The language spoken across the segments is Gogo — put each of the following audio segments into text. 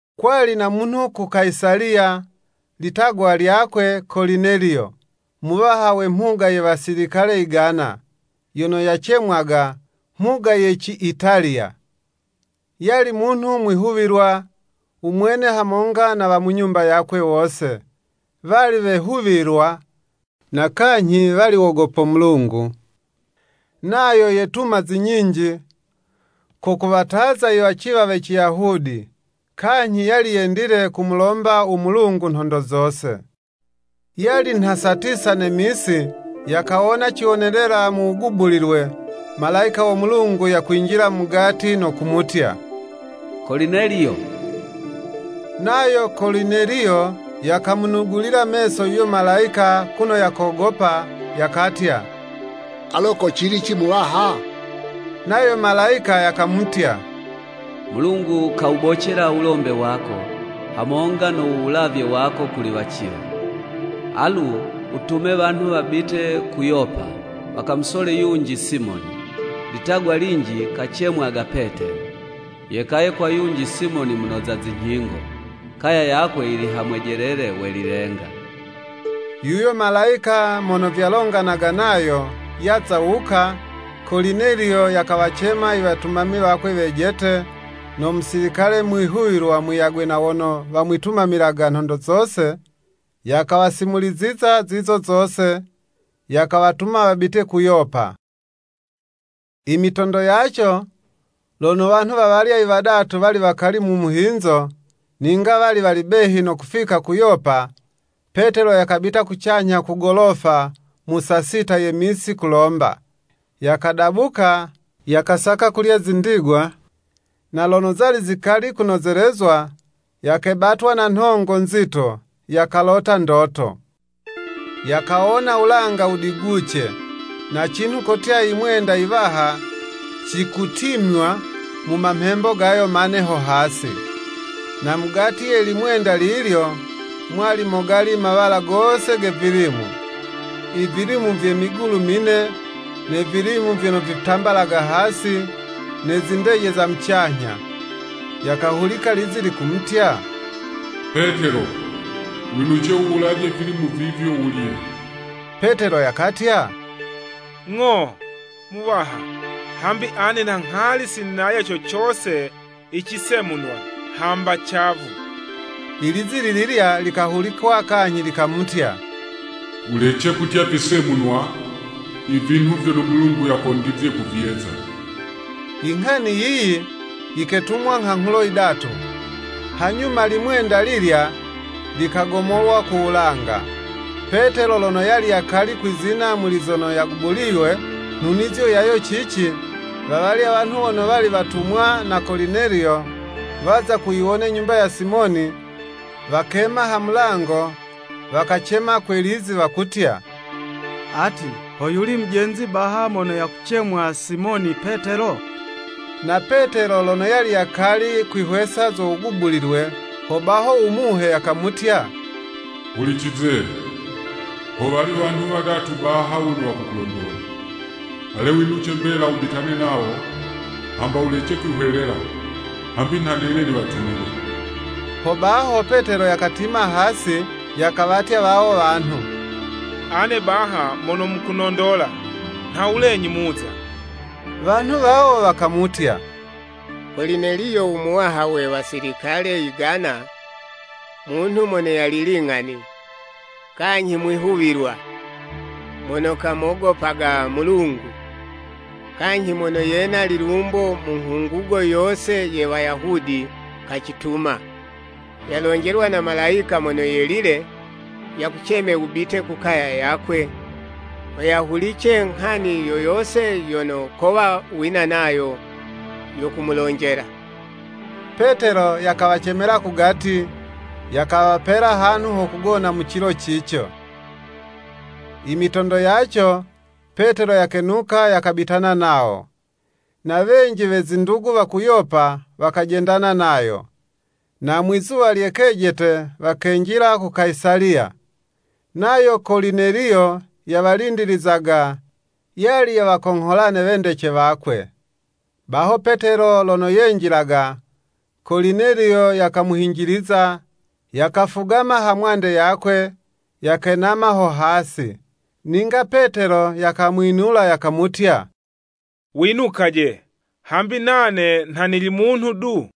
Kwali na munhu ku Kayisaliya, litagwa lyakwe Kolineliyo, muwaha we mhuga ye wasilikale yigana, yono yacemwaga “Mhuga ye ci Italiya.” yali munhu mwihuwilwa, u mwene hamonga na wa mu nyumba yakwe wose, wali wehuwilwa na kanyhi wali wogopo Mulungu, nayo yetuma zi nyinji, ko kuwataza iwaciwa we Ciyahudi, kanyhi yali yendile kumulomba u Mulungu nhondo zose. Yali nha saa tisa ne misi, yakawona ciwonelela mu wugubulilwe, Malayika wo Mulungu yakwinjila mugati no kumutya, “Kolineliyo.” Nayo Kolineliyo yakamunugulila meso yuyo Malayika kuno yakogopa, yakatya, “Alo ko cilici Muwaha?” Nayo Malayika yakamutya, “Mulungu kawubocela wulombe wako, hamonga no wulavye wako kuli waciwa. Alu, wutume wanhu wabite ku Yopa, wakamusole yunji Simoni, litagwa linji kacemwaga Petelo. Yekaye kwa yunji Simoni munoza zinyhingo, kaya yakwe yili ha mwejelele we lilenga.” Yuyo Malayika mono vyalonganaga nayo, yaza wuka, Kolineliyo yakawacema iwetumami wakwe wejete, no musilikale mwihuwilwa, muyagwe na wono wamwitumamilaga nhondo zose, yakawasimuliziza zizo zose, yakawatuma wabite ku Yopa. Imitondo yaco, lono wanhu wawalya i wadatu wali wakali mu muhinzo, ninga wali wali behi no kufika ku Yopa, Petelo yakabita kucanyha ku golofa mu saa sita ye misi, kulomba. Yakadabuka, yakasaka kulya zindigwa, na lono zali zikali kunozelezwa, yakebatwa na nhongo nzito, yakalota ndoto. Yakawona wulanga wudiguce, na cinhu kotya yimwenda yiwaha, cikutimywa mu mamhembo gayo mane ho hasi. Na mugati ye limwenda lilyo, mwali mogali mawala gose ge vilimu, ivilimu vye migulu mine, ne vilimu vyono vitambalaga hasi, ne zindeje za mucanyha. Yakahulika lizi likumutya, “Petelo, winuce wuwulaje vilimu vivyo, wulye.” Petelo yakatya, “Ng'o, Muwaha, hambi ane nha nghali sinalya co cose icisemunwa, hamba cavu.” Ilizi lililya likahulikwa kanyhi likamutya “Wulece kutya visemunwa, ivinhu vyono Mulungu yakondizye kuvyeza.” Inghani yiyi, yiketumwa nghanghulo yidatu, hanyuma limwenda lilya, likagomolwa ku wulanga. Petelo lono yali yakali kwizina muli zono yagubuliywe, nhunizo yayo cici, wawalya wanhu wono wali watumwa na Kolineliyo waza kuyiwona nyumba ya Simoni, wakema ha mulango, wakacema kwe lizi wakutya, “Ati ho yuli mujenzi baha mono yakucemwa Simoni Petelo?” Na Petelo lono yali yakali kwihwesa zo wugubulilwe, ho baho u Muhe yakamutya, “Hulicize! Howali wanhu wadatu baha wono wakukulondola. Ale winuce mbela mubitane nawo, hamba wulece kwihwelela, hambi nha nene niwatumile.” Hobaho Petelo yakatima hasi, yakawatya wawo wanhu, “Ane baha mono mukunondola, nhawulenyi muza?” Wanhu wawo wakamutya, “Kolineliyo u muwaha we wasilikale yigana, munhu mono yali ling'ani, kanyhi mwihuwilwa, mono kamogopago Mulungu, kanyhi mono yena lilumbo mu nghungugo yose ye Wayahudi, kacituma. Yalonjelwa na Malayika mono yelile, yakuceme wubite ku kaya yakwe, ho yahulice nghani yo yose yono kowa wina nayo yo kumulonjela.” Petelo yakawacemela kugati, yakawapela hanhu ho kugona mu cilo cico. Imitondo yaco, Petelo yakenuka yakabitana nawo, na wenji we zindugu wa ku Yopa wakajendana nayo. Na mwizuwa lye kejete, wakenjila ku Kayisaliya. Nayo Kolineliyo yawalindilizaga, yali yawakonghola ne wendece wakwe. Baho Petelo lono yenjilaga, Kolineliyo yakamuhinjiliza, yakafugama ha mwande yakwe, yakenama ho hasi. Ninga Petelo yakamwinula, yakamutya, “Winukaje, hambi nane nha nili munhu du.”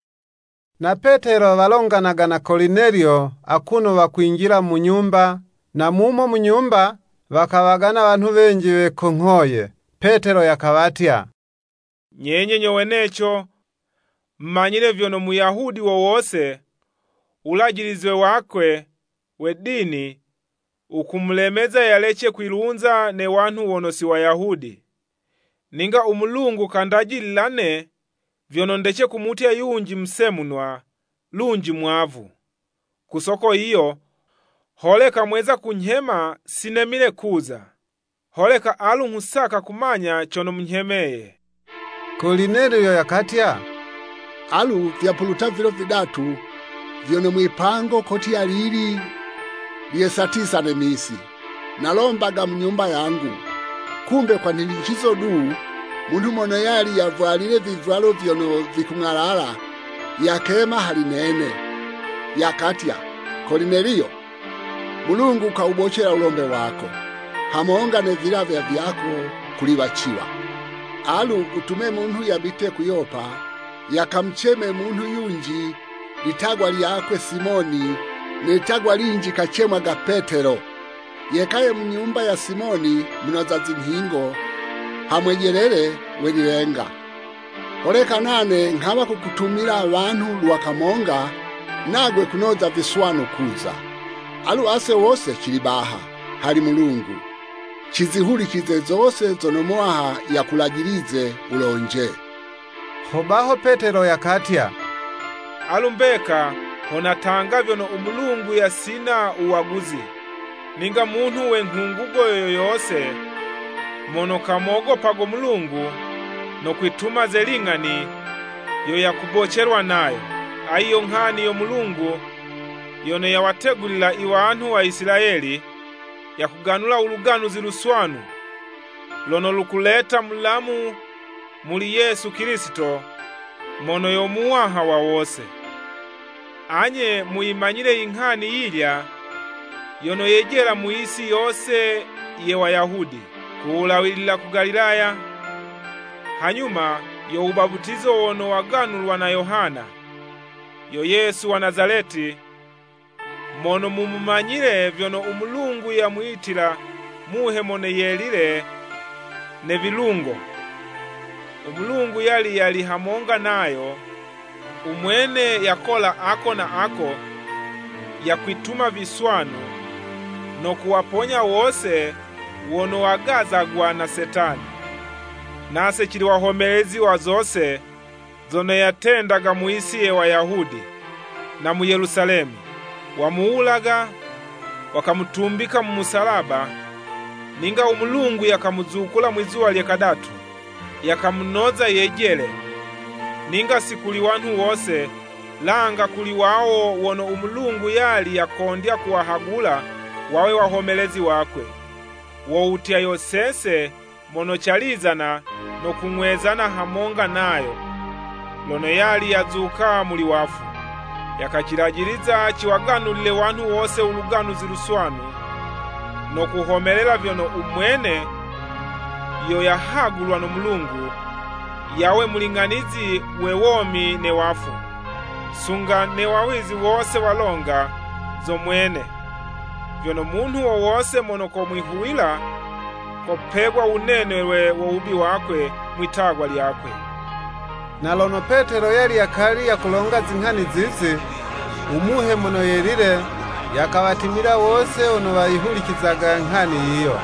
Na Petelo walonganaga na Kolineliyo, akuno wakwinjila mu nyumba, na mumo mu nyumba, wakawagana wanhu wenji wekonghoye. Petelo yakawatya, “Nyenye nyo weneco mumanyile vyono Muyahudi wo wose, wulajilize wakwe we dini wukumulemeza yalece kwilunza ne wanhu wono si Wayahudi. Ninga u Mulungu kandajilila 'ne vyono ndece kumutya yunji musemunwa, lunji mwavu.” Ku soko yiyo holeka mweza kunyhema si nemile kuza. Holeka alu nghusaka kumanya cono munyhemeye? Kolineliyo yakatya, “Alu vyapuluta vilo vidatu vyono mwipango kotya lili, lye saa tisa ne misi, nalombaga mu nyumba yangu, kumbe kwa nhinicizo du, munhu mono yali yavwalile vivwalo vyono vikung'alala, yakema hali nene, yakatya, Kolineliyo, Mulungu kawubocela wulombe wako, hamonga ne vilavywa vyako kuli waciwa.” Alu, wutume munhu yabite ku Yopa, yakamuceme munhu yunji litagwa lyakwe Simoni, ne litagwa linji kacemwaga Petelo, yekaye mu nyumba ya Simoni munoza zinyhingo, ha mwejelele we lilenga. Holeka nane nghawa kukutumila wanhu lwa kamonga, nagwe kunoza viswanu kuza. Alu ase wose cili baha hali Mulungu, cizihulicize zose zono Muwaha yakulajilize wulonje. Hobaho Petelo yakatya, “Alu mbeka ho natanga vyono u Mulungu yasina wuwaguzi. Ninga munhu we nghungugo yo yose, mono kamogopago Mulungu, no kwituma ze ling'ani yo yakubocelwa nayo. Ayi yo nghani yo Mulungu yono yawategulila iwanhu wa Isilayeli, yakuganula u Luganuzi Luswanu lono lukuleta mulamu muli Yesu Kilisito, mono yo Muwaha wa wose. Anye muyimanyile inghani yilya yono yejela mu yisi yose ye Wayahudi, ku wulawilila ku Galilaya, hanyuma yo wubaputizo wono waganulwa na Yohana. Yo Yesu wa Nazaleti, mono mumumanyile vyono u Mulungu yamwitila Muhe Mono Yelile ne vilungo. U Mulungu yali yali hamonga nayo, umwene yakola ako na ako yakwituma viswanu, no kuwaponya wose wono wagazagwa na Setani. Nase cili wahomelezi wa zose, zono yatendaga mu yisi ye Wayahudi, na mu Yelusalemi. Wamuwulaga, wakamutumbika mu musalaba, ninga u Mulungu, yakamuzukula mwizuwa lye kadatu, yakamunoza yejele, ninga si kuli wanhu wose, langa kuli wawo wono u Mulungu yali yakondya kuwahagula wawe wahomelezi wakwe, wo wutya, yo sese mono calizana no kung'wezana hamonga nayo, lono yali yazuka muli wafu. Yakacilajiliza ciwaganulile wanhu wose u Luganuzi Luswanu, no kuhomelela vyono u mwene yo yahagulwa no Mulungu, yawe Muling'anizi we womi ne wafu. Sunga ne wawizi wose walonga zo Mwene, vyono munhu wo wose mono komwihuwila, kopegwa wunenelwe wo wubi wakwe mwi'tagwa lyakwe.” Na lono Petelo yali yakali yakulonga zinghani zizi, u Muhe Mono Yelile yakawatimila wose wono wayihulicizaga nghani yiyo.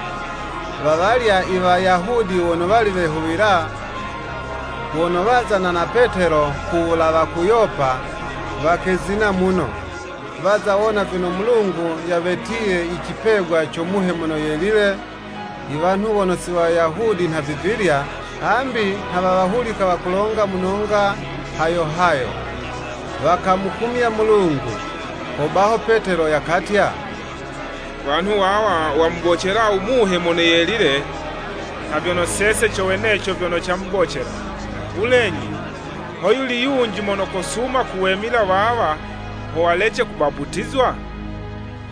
Wawalya Iwayahudi wono wali wehuwila, wono wazana na Petelo kuwulawa ku Yopa, wakezina muno, waza wona vyono Mulungu yawetiye icipegwa co Muhe Mono Yelile iwanhu wono si Wayahudi nhavivilya, hambi nha wawahulika wakulonga mu nonga hayo hayo, wakumukumya Mulungu. Hobaho Petelo yakatya, “Wanhu wawa wamubocela u Muhe Mono Yelile nha vyono sese co weneco vyono camubocela. Wulenyi hoyuli yunji mono kosuma kuwemila wawa ho walece kubaputizwa?”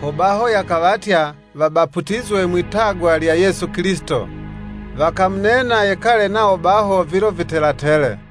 Hobaho yakawatya, wabaputizwe mwi'tagwa lya Yesu Kilisito. Wakamunena yekale nawo baho vilo vitela tele.